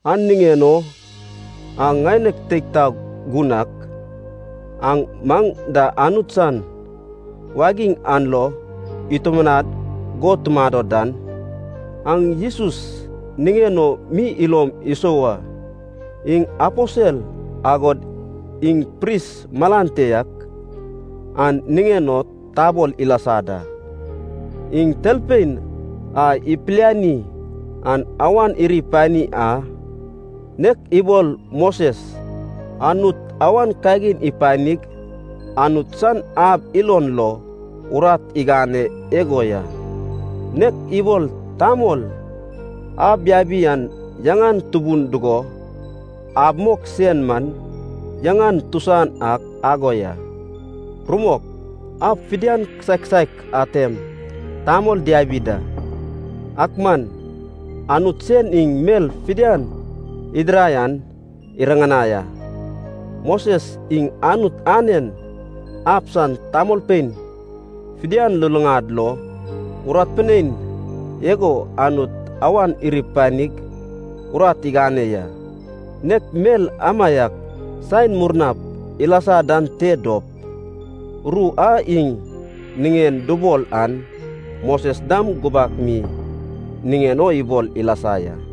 An niŋen o aŋ ŋaineg teig taog gun ak, aŋ maŋ da Anut san wagiŋ an lo itumanad go tumado dan, aŋ Jesus niŋen o mi ilom isou a. Iŋ aposel agod iŋ pris malan te yak an niŋen o tabol ilasa da. Iŋ Talpein a ipiliani an awan iri pani a, nek ibol Moses Anut awan kagin ipanig Anut san ab ilon lo urat igane igo ya. Nek ibol tamol ab yabi an yaŋan tubun dugo ab mok sen man yaŋan tusan ak ago ya. Rumok, ab fidian kisaek kisaek atem tamol diabi da, ak man Anut sen iŋ mel fidian idirai an iriŋanai a. Moses iŋ Anut anen ab san tamolpein fidian luluŋad lo urat pinein igo Anut awan iri panig urat igane ya. Nek mel amaiak saen murnap ilasa dan te dop ru a iŋ niŋen dubol an Moses dam gubak mi niŋen o ibol ilasa ya.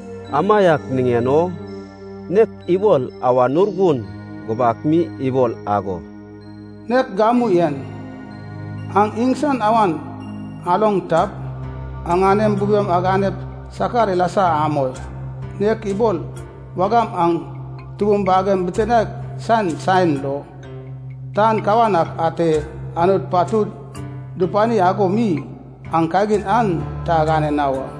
Amaiak niŋen o nek ibol Awan Urgun gubak mi ibol ago, “Nek gamu en, aŋ iŋsan awan aloŋ tap, aŋanem bubem aganep sakar ilasa amoi. Nek ibol wagam aŋ tubum bagem bitinaek san saen lo tan kawan ak ate Anut patud dupani ago mi, aŋ kagin an ta agane na wa.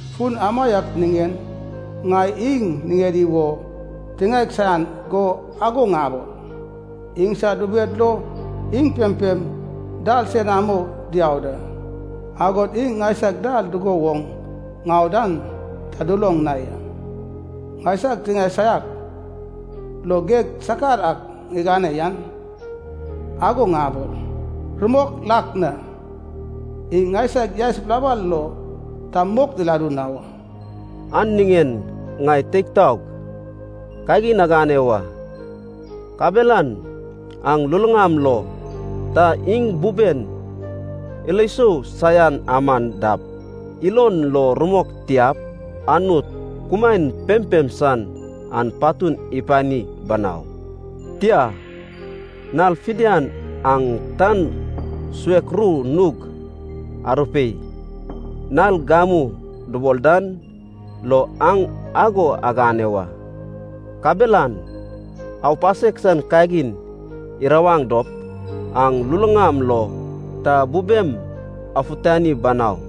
Fun amaiak niŋen ŋai iŋ niŋedi wo tiŋaeg saian go ago ŋabol, ‘Iŋsad bubed lo iŋ pempem dal senamo diau da, agod iŋ ŋaisag dal dugo woŋ ŋau dan ta duloŋ na ya.’ Ŋaisag tiŋae saiak lo geg sakar ak ŋigane yan, ago ŋabol, ‘Rumok lak na, iŋ ŋaisag yaes bilabal lo ta mok diladu na wa.’” An niŋen ŋai teig taog, kagin agane wa. Kabelan aŋ luluŋam lo ta iŋ buben ilo sou saian aman dap, ilon lo rumok tiap, Anut kumaen pempem san an patun ipani banau. Tia, nal fidian aŋ tan suek ru nug arupei, nal “gamu” dubol dan lo aŋ ago agane wa. Kabelan aupasek san kagin irawaŋ dop aŋ luluŋam lo ta bubem afutani banau.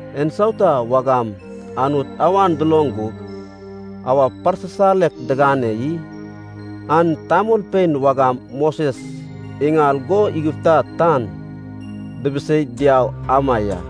En sauta wagam Anut awan duloŋ gug awa parsisalek digane i? An tamolpein wagam Moses iŋal go Igipta tan dibiseig diau ama ya.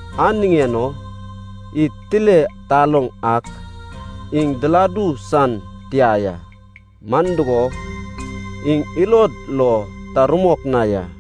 An niŋen o id tile taloŋ ak iŋ diladu san tia ya, man dugo, iŋ ilod lo ta rumok na ya.